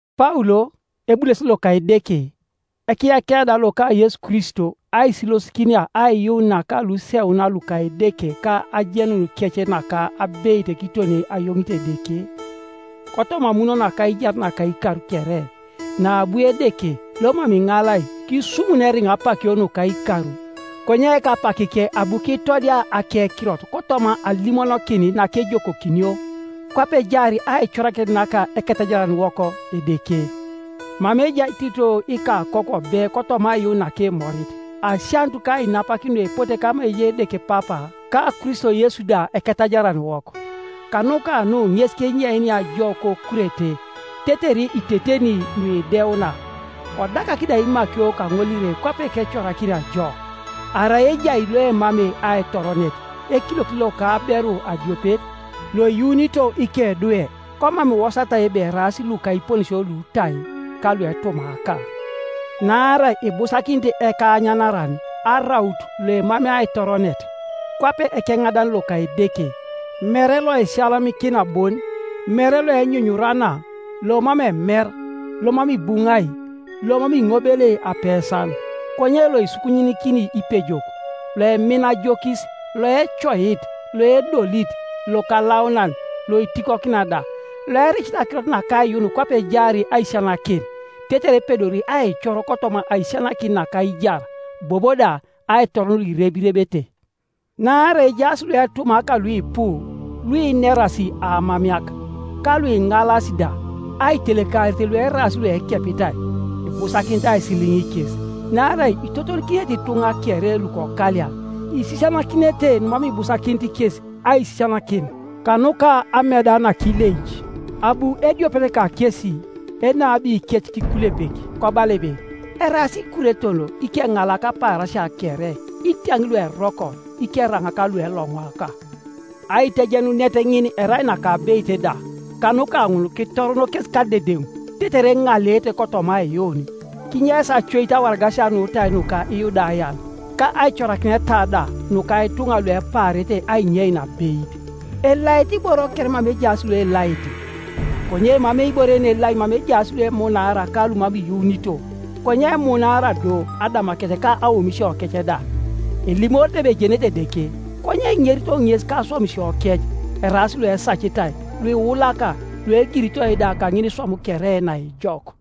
Paul, ebulesit loka Edeke, ekiyakia da loka Yesu Kristo aisilosikinia aiyuun naka luseuna luka Edeke ka ajenunikec naka abeit kiton ayoŋit Edeke, kotoma amun naka aijar naka ikar kere, naabu Edeke, lomam iŋalai, kisumun eriŋa apakio nuka ikar, konye kapakike abu kitodia akekirot kotoma alimonokin nakejokokinio kwape ejaar aicorakinet naka Eketajaraniwok Edeke: Mama ejai Tito ikakoku obe kotoma aiyuun nakimorit: Asianut ka ainapakin nuepote kama ejai Edeke Papa, ka Kristo Yesu da Eketajaraniwok. Kanuka nu ŋes kenyeinia jo koKurete, tetere iteteni nuideuna, kodakak da imakio kaŋolire kwape kecorakinia jo, arai ejai loemamei aitoronet, ekiliokit loka aberu adiopet, loiyuunito ikedwe, komam iwosatai ebe eraas luka iponesio lutai, ka luetumaaka. Naarai ibusakinit ekaanyanaran araut loemamei aitoronet, kwape ekeŋadan loka Edeke; mere loisiyalamikina bon, mere loenyunyurana, lomam emer, lomam ibuŋai, lomam iŋobelei apesan, konye loisukunyikini ipejok, loemina ajokis, loecoit, loedolit, lokalaunan, loitikokina da; loericit akirot naka aiyuun kwape ejaar aisisianakin, tetere epedori aicor kotoma aisisianakin naka aijar, bobo da aitoron luirebirebete. Naarai ejaas luetumaaka luipu, luinerasi aamameak, ka luiŋalas da, aitelekarit lueraas luekepitai. Ibusakinit aisililiŋ kes, naarai itotolikinete ituŋa kere lukokalia, isisianakinete numam ibusakinit kes aisisianakin, kanuka ameda nakileic. Abu ediopet kakesi, enabikec kikulepek, kobala ebe, “Eraas Ikureton ikeŋalak apaarasia kere, itiaŋ lueroko, ikeraŋak lueloŋwaka.” Aitejenunet ŋin erai nakabeit da, Kanuka ŋun kitoron kes kadedeŋ, tetere eŋaleete kotoma aiyuun, kinyeis acoit awaragasia nutai nuka Iyudayan, ka aicorakineta da nuka ituŋa luepaarete ainyein abeit. Elaete iboro kere mama ejaas luelaete. Konye emamei ibore yenelai mama ejaas luemunaara ka lumam iyuunito; konye emunaara do adamakec ka aomisiokec da. Elimorete ebe ejenete Edeke, konye eŋerito ŋes kaswamisiokec; eraas luesacitai, luiulaka, luegiritoi da kaŋiniswam kere naejok.